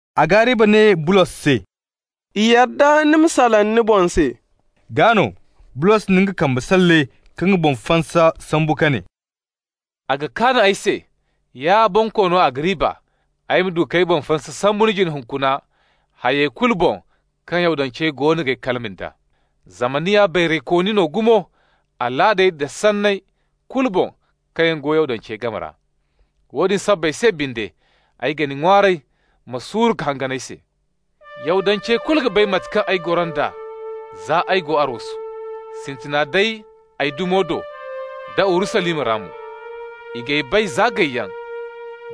Agariba ne Bulos se: «I yadda ni ma salaŋ ni boŋ se.» Gaa no Bulos na nga kambe salle ka nga boŋ fansa sambu ka ne: «A ga kaan ay se, ya Bonkoono Agariba, ay ma du k'ay boŋ fansa sambu ni jine hunkuna, hay kulu boŋ kaŋ yaŋ Yahudancey goono g'ay kalima nd'a. Zama ni ya bayraykooni no gumo alaadey da sanney kulu boŋ kaŋ yaŋ go Yahudancey game ra. Woodin sabbay se binde, ay ga ni ŋwaaray, ma suuru ka hangan ay se. Yahudancey kulu ga bay da mate kaŋ ay goro nd'a, za ay go arwasu, sintina day ay dumo do, da Urusalima ra mo. I g'ay bay za gayyaŋ,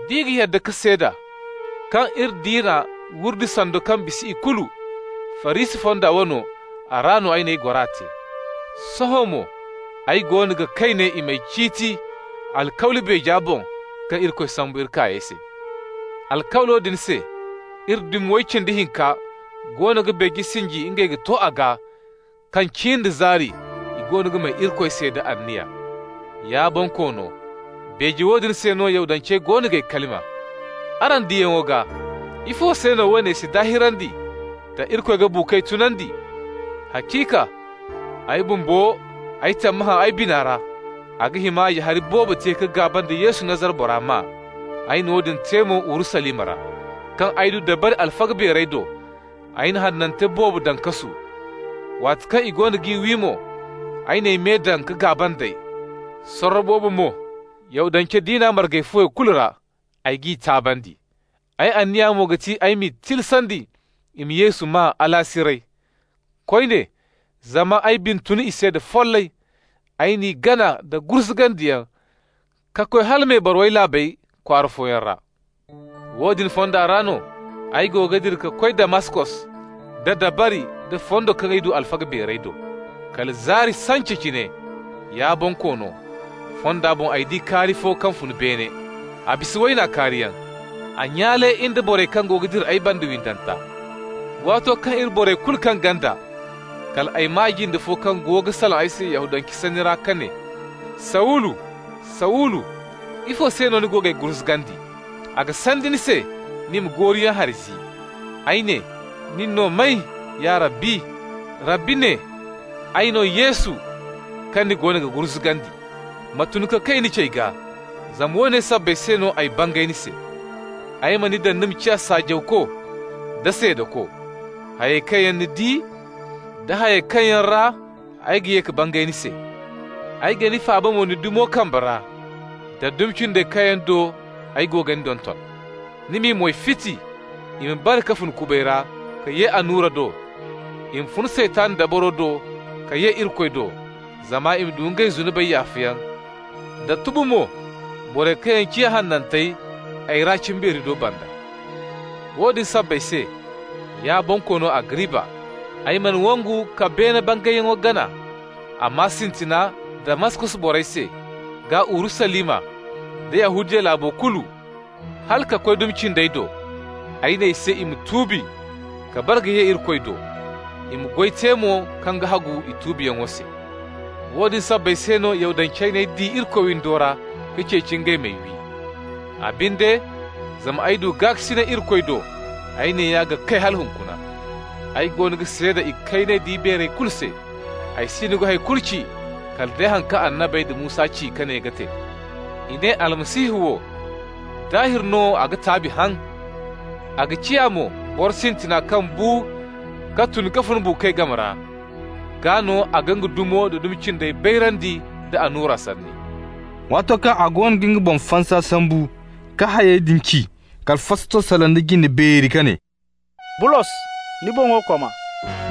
d'i ga yadda ka seeda, kaŋ iri diina wurdi sando kaŋ bisa ikulu, Farisi fonda wano, a ra no ay n'ay gora te. Sohõ mo ay goono ga kay ne i m'ay ciiti alkawli beeja boŋ kaŋ Irikoy sambu iri kaayey se. Alkawlo din se iri dumi way cindi hinka goono ga beeje sinji ngey ga to a gaa, kaŋ cin da zaari i goono ga may Irikoy se da anniya. Ya Bonkoono, beeje woodin se no Yahudancey goono g'ay kalima. Araŋ diyaŋo gaa, ifo se no woone si daahirandi, da Irikoy ga buukoy tunandi? Haciika ay bumbo, ay tammahã ay bina ra a ga hima ya hari boobo te ka gaaba nda Yesu, Nazara bora maa. Ay na woodin te mo Urusalima ra. Kaŋ ay du dabari alfaga beerey do, ay na hanantey boobo daŋ kasu. Waati kaŋ i goono g'i wi mo, ay n'ay me daŋ ka gaaba nd'ey. Sorro boobo mo Yahudance diina marga fuwey kulu ra, ay g'i taabandi. Ay anniya mo ga ti ay m'i tilasandi i ma Yesu maa alaasiray. Koyne, zama ay bina tun i se da follay, ay n'i gana da gurzugandiyaŋ ka koy hala mebarawey laabey kwaara fooyaŋ ra. Woodin fonda ra no, ay go ga dira ka koy Damaskos da dabari da fondo kaŋ ay du alfaga beerey do. Kala zaari sance cine, ya Bonkoono, fonda boŋ ay di kaari fo kaŋ fun beene. A bisa wayna kaariyaŋ, a nyaale in da borey kaŋ go ga dira ay banda windanta. Waato kaŋ iri borey kulu kaŋ ganda, kal ay maa jinde fo kaŋ go ga salaŋ ay se Yahudance sanni ra ka ne: ‹Sawulu, Sawulu, ifo se no ni goono g'ay gurzugandi? A ga sandi ni se ni ma gooruyaŋ hari zi.› Ay ne: ‹Nin no may, ya Rabbi?› Rabbi ne: ‹Ay no Yesu, kaŋ ni goono ga gurzugandi. Ma tun ka kay ni cey gaa, zama woone sabbay se no ay bangay ni se: ay ma ni daŋ ni ma ciya saajawko da seedako, hayey kaŋ yaŋ ni di, da hayey kaŋ yaŋ ra ay ga ye ka bangay ni se. Ay ga ni faaba mo ni dumo kambe ra, da dumi cindey kaŋ yaŋ do ay go ga ni donton. Ni m'i moy fiti, i ma bare ka fun kubay ra ka ye annura do, i ma fun Saytan dabaro do ka ye Irikoy do, zama i ma du ngey zunubey yaafayaŋ, da tubu mo borey kaŋ yaŋ ciya hanantey ay ra cimbeeri do banda.› Woodin sabbay se, ya Bonkoono Agariba, ay mana wangu ka beene bangayyaŋo gana, amma sintina Damaskos borey se, gaa Urusalima, da Yahudiya laabo kulu, hala ka koy dumi cindey do, ay ne i se i ma tuubi ka bare ka ye Irikoy do, i ma goy te mo kaŋ ga hagu i tuubiyaŋo se. Woodin sabbay se no Yahudancey n'ay di Irikoy windo ra ka ceeci ngey m'ay wi. Ay binde, zama ay du gaakasinay Irikoy do, ay neeya ga kay hala hunkuna. Ay goono ga seeda ikayney da ibeerey kulu se. Ay siino ga hay kulu ci kala day haŋ kaŋ annabey da Musa ci ka ne ga te: I ne Almasihu wo, daahir no a ga taabi haŋ, a ga ciya mo boro sintina kaŋ bu ka tun ka fun buukoy game ra, gaa no a ga nga dumo da dumi cindey bayrandi nda annura sanni.» Waato kaŋ a goono ga nga boŋ fansa sambu ka hayey din ci, kala Fastos salaŋ da jinde beeri ka ne: «Bulos, ni boŋo koma!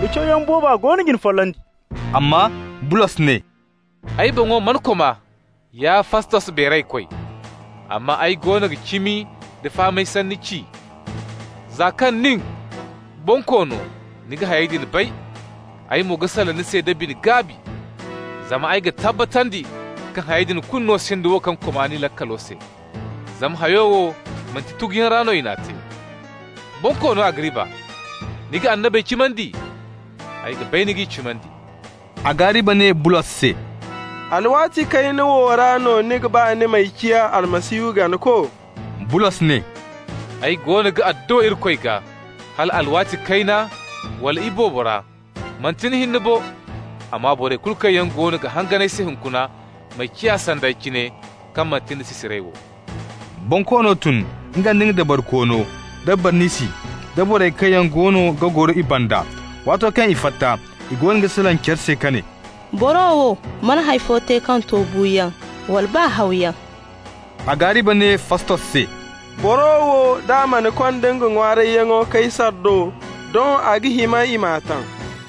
Ni cawyaŋ booba goono ga ni follandi!» Amma Bulos ne: «Ay boŋo mana koma, ya Fastos beeraykoy, amma ay goono ga cimi da fahamay sanni ci. Za kaŋ nin, Bonkoono, ni ga hayey din bay, ay mo ga salaŋ ni se da bine-gaabi. Zama ay ga tabbatandi kaŋ hayey din kulu no sinda wo kaŋ koma ni laakalo se, zama hayo wo manti tuguyaŋ ra no i n'a te. Bonkoono Agariba, ni ga annabey cimandi? Ay ga bay ni g'i cimandi!» Agariba ne Bulos se: «Alwaati kayna wo ra no ni ga ba ni m'ay ciya Almasihu ganako?» Bulos ne: «Ay goono ga adduwa Irikoy gaa, hala alwaati kayna wala alwaati boobo ra, manti ni hinne bo, amma borey kulu kaŋ yaŋ goono ga hangan ay se hunkuna ma ciya sanda ay cine, kaŋ manti nda sisirey wo.» Bonkoono tun, nga nda dabarikoono da Barnisi, da borey kaŋ yaŋ goono ga goro i banda. Waato kaŋ i fatta, i goono ga salaŋ care se ka ne: «Boro wo mana hay fo te kaŋ to buuyaŋ wala baa hawyaŋ.» Agariba ne Fastos se: «Boro wo, d'a mana konda nga ŋwaarayyaŋo Kaysar do, doŋ a ga hima i m'a taŋ.»